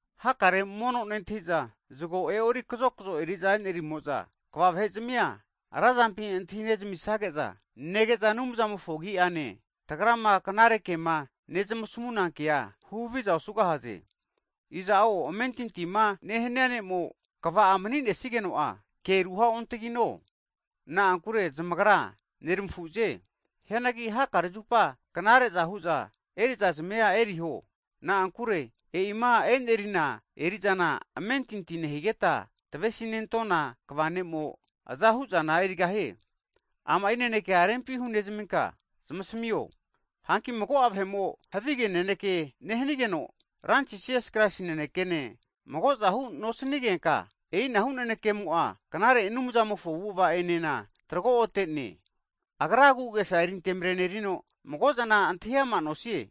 Hakare mono nentahi'za zgo e'ori kazokzo eri'za enerimo'za kva vahezmi'a razampi antahinezmisage'za, nege'za Anumzamofo agi'ane, tagrama knare kema nezmasmuna kea huhaviza osugahaze. Iza'o amentintima nehnia ne'mo kva'a mani'nesigeno'a, kea ruha'ontagino, na'ankure zamagra neramafuze. Hianagi hakare zupa knare hu'za eriza'zmia eriho, na'ankure e'ima e'nerina eri'zana amentinti nehigeta tvesi'nentona kva ne'mo azahuzana erigahie. Ama'i naneke rempi hunezminka zamasmio. Hanki mago'a vahe'mo havige naneke nehnigeno, Ranti Jisas Kraisi nanekene, mago'zahu nosnigenka, e'inahu nanekemo'a knare Anumzamofo avu'ava enena trago'otene, agra agu'agesa eri antemrenerino mago'zana antahi ama nosie,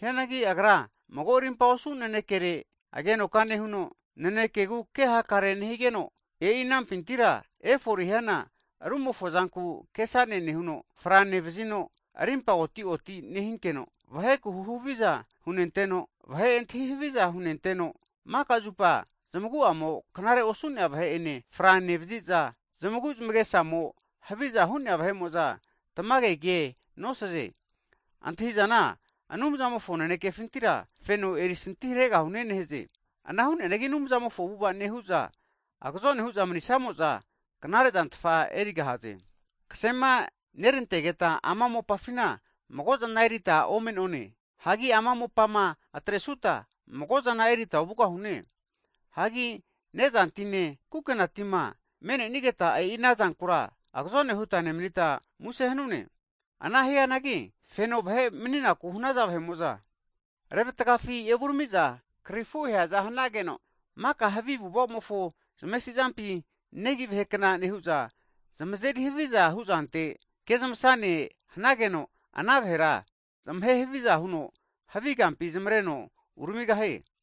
hianagi agra mago arimpa osu nanekere agenoka nehuno, nanekegu ke hakare nehigeno, e'i anampintira efore hiana rumofo zanku kesane nehuno, fra nevzino, rimpa oti'oti nehinkeno, vahe'ku huhaviza hunenteno, vahe antahi haviza hunenteno, maka'zupa zamagu'amo knare osu'nea vahe ene fra nevziza, zamagu zamagesamo haviza hu'nea vahe'mo'za tamage kea nosaze. Zamagrama antahi'zana Anumzamofo nanekefintira feno erisanti haregahune nehaze. Ana hu'neanagi Anumzamofo avu'avama nehu'za agzone hu'za mani'snamo'za, knare zantfa erigahaze. Ksema nerantageta ama mopafina mago'zana erita ome'none, hagi ama mopama atresuta mago'zana erita ovugahune. Hagi ne'zantine kukenatima me'nenigeta, e'i ana zankura agzone huta nemnita muse hanune. Ana hianagi feno vahe maniku hanaza vahe'mo'za, rezmatagafi evurami'za krifu aheaza hanageno, maka havi avu'avamofo zamesi'zampi negi vahe kna nehu'za, zamazeri haviza huzante kezmasane hanageno, ana vahera zamahe haviza huno havi kampi zamareno uramigahie.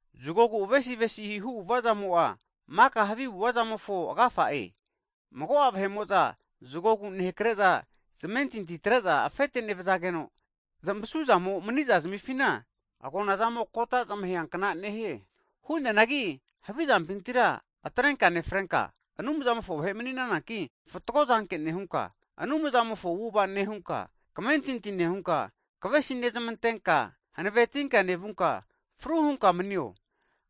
Zgogu avesi avesihu avu'avazamo'a maka havi avu'avazamofo agafa'e. Mago'a vahe'mo'za zgogu nehakre'za zamentinti atre'za afete nevzageno, zamasuzamo mani'za zamifina agonazamo kota zmahea kna nehie. Hu'neanagi havizampintira atrenka nefrenka, Anumzamofo vahe mani'nananki, fatgo zanke nehunka, Anumzamofo avu'ava nehunka, kmentinti nehunka, kvesi nezmantenka, hanavetinka nevunka fru hunka manio.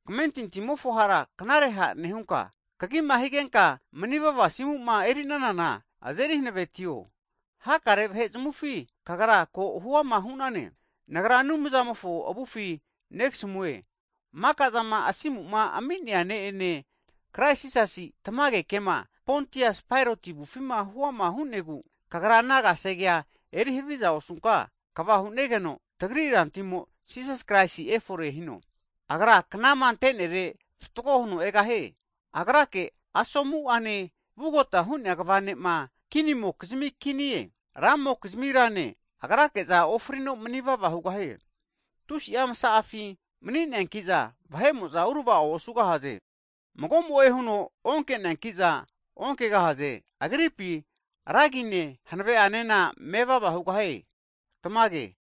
Kmentintimofo hara knare ha' nehunka, kagima higenka manivava asimu'ma eri'nanana azeri hanavetio, hakare vahe zamufi kagra ko huama hu'nane. Nagra Anumzamofo avufi negasmue, maka'zama asimu ami'nea ne'ene, Kraisi Jisasi tamage kema Pontias Pailoti avufima huama hu'negu, kagra ana kasegea eri haviza osunka kva hu'negeno, tagri Rantimo Jisas Kraisi efore hino. Agra knama ante'nere fatgo huno egahie, Agrake asomu'ane vugota hu'nea kva ne'ma (sovereign) kinimo'kizmi Kinie, ra'mokizmi Rane, Agrake'za ofrino mani'vava hugahie, tusi'a msa'afi mani'neankiza vahe'mo'za urva'o osugahaze. Mago'mo'e huno onke'neanki'za onkegahaze. Agripi Ra agine, hanave'anena mevava hugahie. Tmage.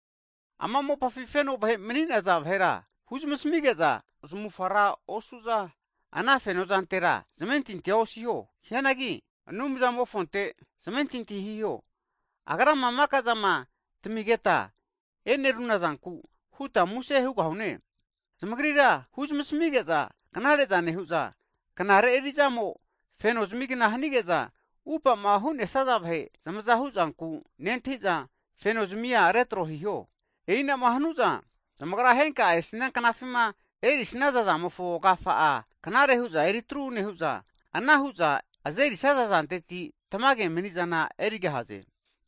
Ama mopafi feno vahe mani'naza vahera huzamasmige'za, ana fenozantera zamufa ra osu'za, ana fenozantera zamentinti osiho, hianagi Anumzamofonte zamentinti hiho, Agrama maka'zama tmigeta eneruna'zanku huta muse hugahune. Zamagrira huzamasmige'za knare'za nehu'za, knare eri'zamo feno zamigna hanige'za, upama hu'nesaza vahe zamaza hu'zanku nentahi'za, feno zamia retro hiho, E'inama hanu'za, zamagra henka'a esnia knafima erisnaza zamofo agafa'a knare hu'za eri atru nehu'za, ana hu'za azerisaza zanteti tamage mani'zana erigahaze.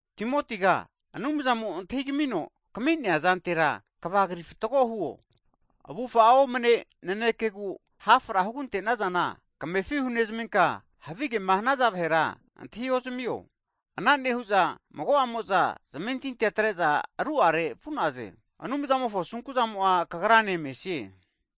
Timotiga, Anumzamo antahi kamino kmi'nea erizantera kvagri fatgo huo, avufa'a omne'nea nanekegu hafra hugante'nazana, kamefi hunezminka havigema hanaza vahera antahi'ozamio. Ana nehu'za mago'amo'za zamentintia atre'za ru'are vu'naze. Anumzamofo asunku'zamo kagrane mesie.